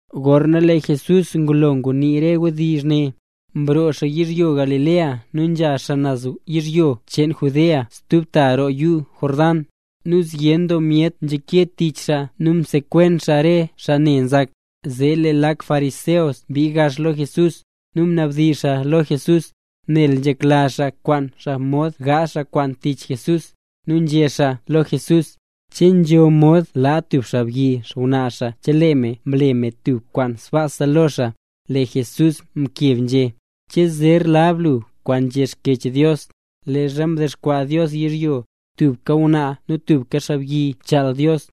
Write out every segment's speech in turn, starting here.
Gorna lee Jesús ngulo ngunii re wdizh ne, mroo xaa yizhyo Galilea nu nzha xaa naz yizhyo cheen Judea stub ta roo yuu Jordán. Nu zyen doo myet nzhake tich xaa nu msekwen xaa re xaa ne nzak. Zee lee lak xaa fariseo mbii gax lo Jesús, nu mnabdizh xaa lo Jesús, nel nzhekla xaa kwaan xaa mod zee gaazh xaa tub kwaan tich Jesús, nu nzhé xaa lo Jesús: —¿Che nzho mod laa tub xaabyi xngwnaa xaa chelee me mle me tub kwaan sbaasa lo xaa? Lee Jesús mkeb nzhé: —¿Che zer lab gu kwaan nzhé Xkyech Dios, leezha mdexkwaa Dios yizhyo, tubka ngwnaa nu tubka xaabyi mchaal Dios?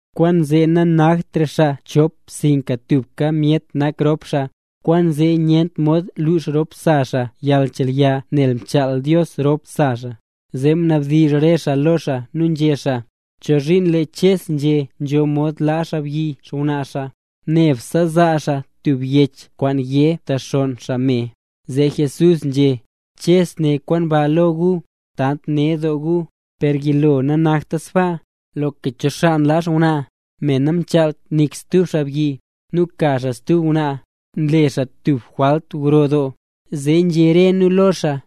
Kwaanzee nanaktra xaa chop sinka tubka myet nak rop xaa. Kwaanzee nyent mod lux rop sa xaa yalnchelya nel mchaal Dios ropse xaa. Zee mnabdizh re xaa lo xaa nu nzhé xaa: —¿Chozhiin lee Ches nzhé nzho mod laa xaabyi xngwnaa xaa, nebse zaa xaa tub yech kwaan yé mtexonn xaa me? Zee Jesús nzhé: —Ches né kwaan ba lo gu, tant ned doo gu, per yilo nanakta sbaa. Loka cho xaa nlaa xngwnaa, me namchaalt nik stub xaabyi, nu ka xaa stub ngwnaa, nle xaa tub jwalt gro doo. Zee nzhé re nu lo xaa: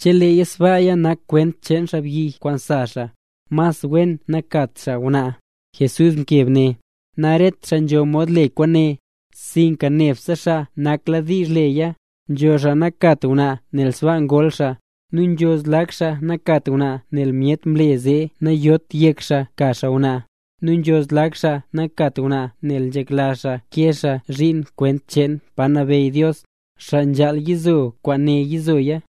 —Cheleeya sbaa nak kwent cheen xaabyi kwaan sa xaa, mas wen nakat xaa ngwnaa. Jesús mkeb né: —Naret xaa nzho mod le kwaane, sinka nebse xaa nakladiizh leya. Nzho xaa nankat ngwnaa nel sbaa ngol xaa, nu nzho zlak xaa nankat ngwnaa nel myet mle zee nayot yek xaa ka xaa ngwnaa, nu nzho zlak xaa nankat ngwnaa nel nzhekla xaa kee xaa zhiin kwent cheen pa nabeyy Dios. Xaa nzhaal yizo kwaane yizoya.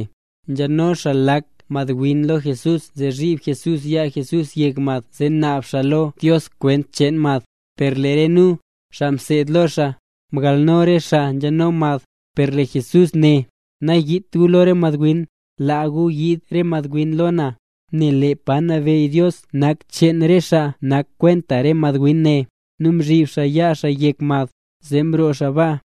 Nzhano xaa lak madwin lo Jesús zee zhib Jesús yaa Jesús yek mad zee naab xaa lo Dios kwent cheen mad. Per lee re nu, xaa mseed lo xaa, mgalno re xaa nzheno mad. Per lee Jesús né: —Nayiit gu lo re madwin, laa gu yiid re madwin lo na, nel lee pa nabeyy Dios nak cheen re xaa nak kwenta re madwin ne. Nu mzhib xaa yaa xaa yek mad. Zee mroo xaa baa.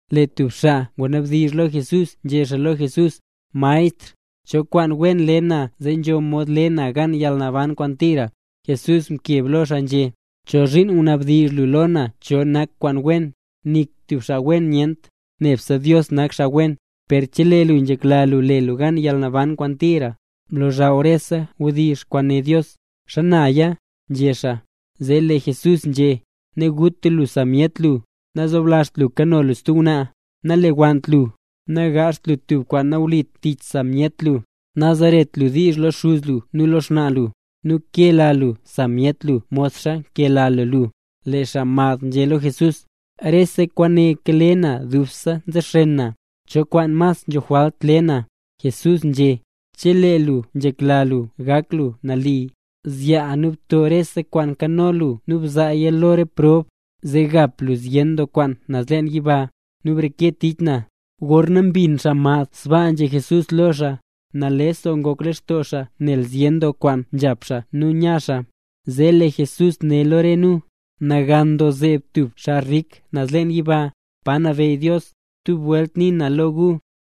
Lee tub xaa ngwanabdizh lo Jesús, nzhé xaa lo Jesús: —Maestr, ¿cho kwaan wen le na zee nzho mod le na gan yalnaban kwaan tira? Jesús mkeb lo xaa nzhé: —¿Chozhiin mnabdizh lu lo na cho kwaan nak kwaan wen? Nik tub xaa wen nyent, nebse Dios nak xaa wen. Per chelee lu nzhekla lu le lu gan yalnaban kwaan tira, blozhaw re wdizh kwaan né Dios. —¿Xanaya? —nzhé xaa. Zee lee Jesús nzhé: —Naguta lu sa myet lu, nazoblazht lu kano lu stub ngwnaa, nalewannt lu, nagaazht lu tub kwaan nawlit tich sa myet lu, nazeret lu diizh lo xuz lu nu lo xnaa lu, nu kela lu sa myet lu modxa nkela lu lu. Lee xaa mad nzhé lo Jesús: —Rese kwaane kale na dubse nzexen na. ¿Cho kwaan mas nzho jwalt le na? Jesús nzhé: —Chelee lu nzhekla lu gak lu nali, zyaa nu bto rese kwaan nkano lu nu bzaaya lo prob, zee gap lu zyen doo kwaan naz leen yiba, nu breke tich na. Gorna mbin xaa mad sbaa nzhé Jesús lo xaa, nales doo ngok lextoo xaa nel zyen doo kwaan nzhap xaa nu nya xaa. Zee lee Jesús né lo re nu: —¡Nagan doo zeeb tub xaa rik naz leen yiba, pa nabeyy Dios! Stub welt nii na lo gu,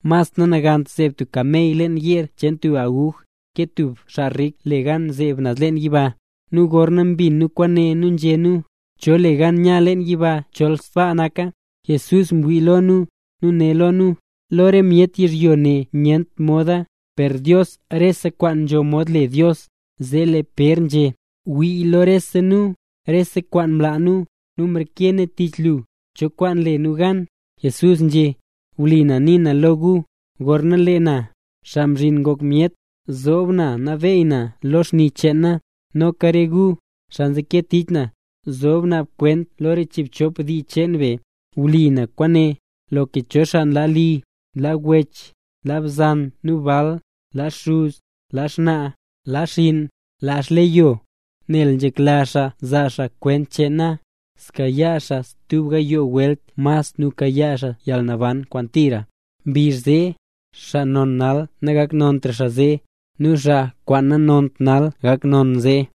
mas nanagant zeeb tub kamey leen yeer cheen tub aguj, ke tub xaa rik le gan zeeb naz leen yiba. Nu gorna mbin nu kwaane, nu nzhé nu: —¿Cho le gan nya leen yiba chol sbaa naka? Jesús mwii lo nu, nu né lo nu: —Lo re myet yizhyo ne nyent moda, per Dios rese kwaan nzho mod le Dios. Zee lee Pér nzhé: —¡Wii lo rese nu, rese kwaan mlaa nu, nu mreke nu tich lu! ¿Cho kwaan le nu gan? Jesús nzhé: —Wlipa na nii na lo gu, gorna lee na, Xaa Mzhin Ngok Myet, zoob na nabeey na lo xni cheen na, noka re gu, xaa nzeke tich na, zob naab kwent lo re chiibchop dii cheen be. Wlipa kwaane, loka cho xaa laa li, laa wech, laa bzan nu bal, laa xuz, laa xnaa, laa xinn, laa xleyo, nel nzhekla xaa zaa xaa kwent cheen na, zkayaa xaaya tub gayoo welt mas nu kayaa xaa yalnaban kwaan tira. Mbizh zee, xaa kwaan non nal nagaknontra zee; nu xaa kwaan nanont nal gak non zee.